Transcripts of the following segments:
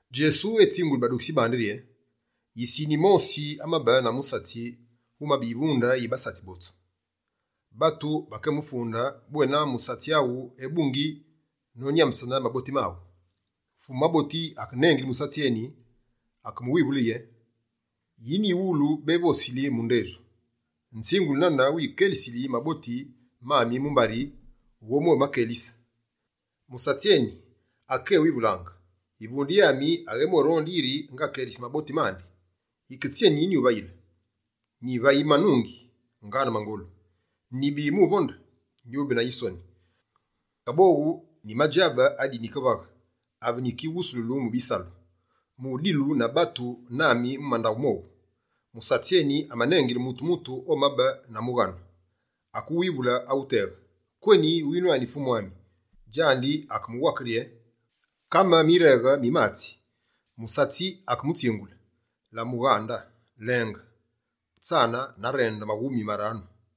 Djesu etsinguli badukitsi bandi rye: «Yisine yimosi amabe na musatsi wumabe yivunde yi basatsi botsu. Batu bakemufunde bwena: “Musatsi aghu ebungi nonyambesene maboti maghu.” Fumu maboti akenengile musatsi eni, akemuwivule yiri: “Yi nyiwulu bévosili mu ndedju? Nzinguli nane wikelisili maboti mami mumbari wughobwémakelise.” Musatsi eni, akekéwivulaange: “Yivunde yami aghébwéronde yiri ngakelise maboti mandi. Yike tsyeni nyuvayile? Nyivayi manungi, ngaane mangolu; nyibi mu uvonde, nyube na yisoni. Kaboghu nyimadjabe adi nyikivaghe ave nyikighusululu mu bisalu, mu udilu na batu nami mu mandaghu mowu.” Musatsi eni amanengile mutu-mutu omabe na mughanu. Akewivule awuteghe: “Kweni winwani Fumu ami?” Djandi akemuwake rye: “Kame mireghe mi matsi.” Musatsi akemutsingule: “La mughande, lenge utsane na rende maghumi maranu.”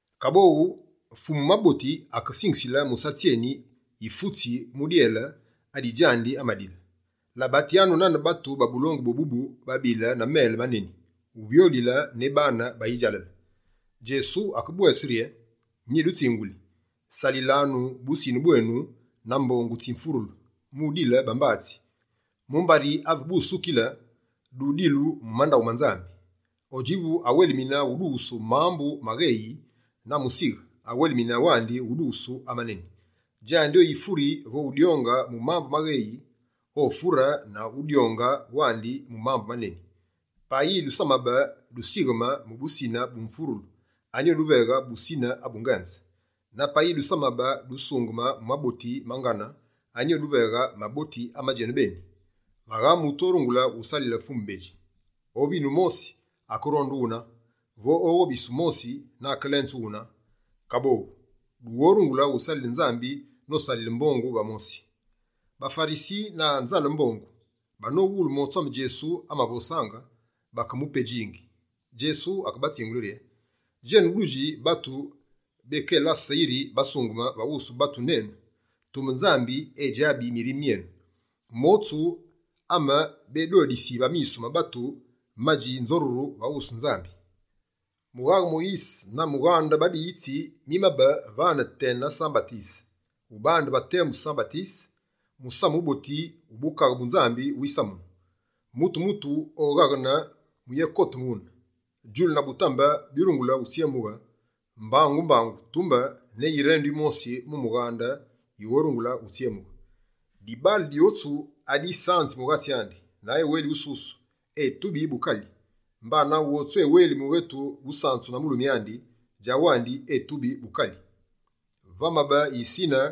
Kaboghu, fumu maboti akesingisile musatsi eni yifutsi mu dyele adi djandi amadile. Labatyanu nane batu ba bulongu bwébubu babile na mele maneni, wuvyoghulile ne baane ba yidjalale.» Djesu akebwese rye: «Nyidutsinguli, salisanu busine bwenu na mbongu tsi mfurulu, mu udile bambatsi, mumbari ave busukile, dudilu mu mandaghu ma Nzambi. Odjivu awelimine udughusu mambu amagheyi na musighe, awelimine wandi udughusu amaneni. Djandi oyifuri vo udyonge mu mambu magheyi, ofure na udyonge wandi mu mambu amaneni. Payi dusamabe dusigheme mu busine bu mfurulu, anyi oduveghe busine abu ngenze? Na payi dusamabe dusungeme mu maboti ma ngane, anyi oduveghe maboti amajenu beni? Vagha mutu orungule usalile fumu bedji: ovine wumosi, akeronde wune, vo oghobise wumosi na akelenze wune. Kaboghu, dughorungule usalile Nzambi nosalile mbongu va mosi.» BaFarisi, na nzale mbongu, banowulu motsu ame Djesu amavosaange, bakemupedjingi. Djesu akebatsingule rye: «Djenu dudji batu békelase yiri basungeme va wusu batu nenu, tumbe Nzambi edjabi mirime myenu. Motsu, ame bédodisi va misu ma batu, madji nzoruru va wusu Nzambi. Mughaghe Moyise na mughande babiyitsi mimabe vane tena San-Batise. Ubandile va temu San-Batise, musamu wuboti wu Bukaghe bu Nzambi wisamunu. Mutu-mutu oghaghene mu uyékote wune. Djulu na butambe byurungule utsyemughe mbangu-mbangu, tumbe ne yirendu yimosi mu mughaghe yighorungule utsyemughe. Dibaale dyotsu adisanzi mughatsi andi na eweli wususu, etubi bukali. Mbana, wotsu eweli mughetu wusanzu na mulumi andi, djawandi etubi bukali.» «Vamabe yisine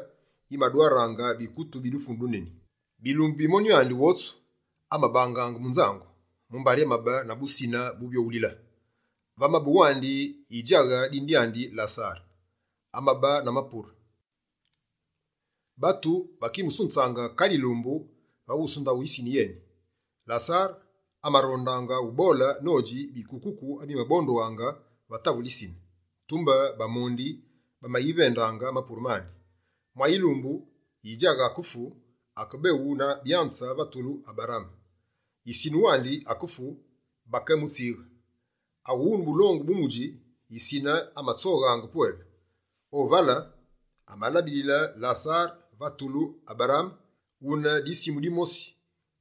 yimadwaraange bikutu bi dufunu duneni. Bilumbu bi monyu andi wotsu, amabangaange mu nzangu, mumbari amabe na busine buvyoghulile. Vamabe wandi yidjaghe dine dyandi Lasare, amabe na mapure. Batu bakimusunzaange kale yilumbu va mune ndaghu yisine yeni. Lasare, amarondaange ubole nodji bikukuku abimabondughaange va tavule yisine. Tumbe bamondi bamayivendaange mapure mandi. Mwa yilumbu, yidjaghe akefu, akebeghu na byanze va tulu Aberaame. Yisine wandi akefu, bakemutsighe. Aghune bulungi bu mudji, yisine amatsoghaange pwele. O vale, amabilile Lasare va tulu Aberaame. Wune disimu dimosi,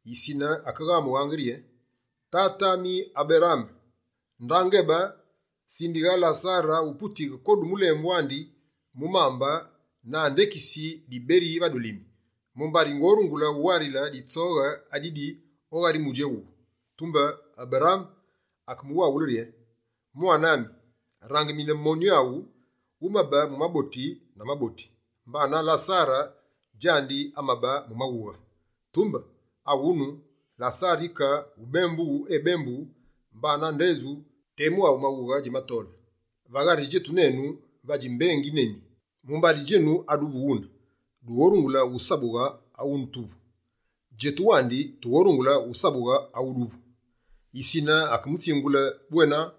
yisine akeghamughe rye: “Tate ami Aberaame, nda ngebe. Sindighe Lasare aputiyi kodu mulembu andi mu mambe na andekisi diberi va dulimi, mumbari ngorungule wuwarile ditsoghe adidi o ghari mudji éwuwu.” Tumbe Aberaame akemuwaghule rye: “Mwane ami, rangimine monyu aghu, wumabe mu maboti na maboti, mbana Lasare djandi amabe mu maghughe. Tumbe aghunu, Lasare yike wubembughu, ebembughu, mbana ndedju, temu awumaghughe djimatole. Va ghari djetu nenu vadji mbengi neni, mumbari djenu aduvu wune, dughorungule usabughe awutuvu. Djetu wandi, tughorungule wusabughe awuduvu.” Yisine akemutsingule bwena: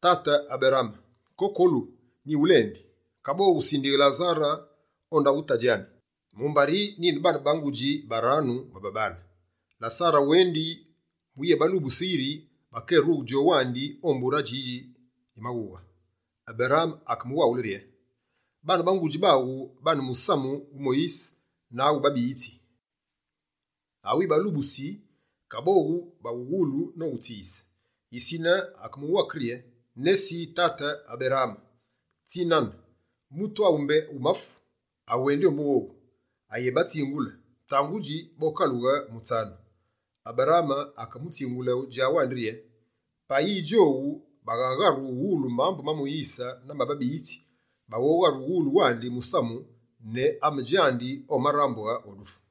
“Tate Aberaame kokolu nyighulendi, kaboghu sindighe Lasare o ndaghu tadji ami. Mumbari nyine baane ba ngudji baranu ba babaale. Lasare awendi mu uyébalubuse yiri bakérughe djowu wandi o mbure adjidji dji maghughe.” Aberaame akemuwaghule rye: “Baane ba ngudji baghu bane musamu wu Moyise na awu babiyitsi awibalubusi, kaboghu bawughulu nowutsiyise!” Yisine akemuwake rye: “Nesi tate Aberaame tsinane. Mutu awu mbé wumafu, awendi ombu wowu, ayebatsingule, tangudji bokalughe mutsanu.” Aberaame akemutsingule djawandi rye: “Payi djowu baghagharu uwulu mambu ma Moyise na ma babiyitsi, baghogharu uwulu wandi musamu ne ame djandi omarambughe o dufu.”»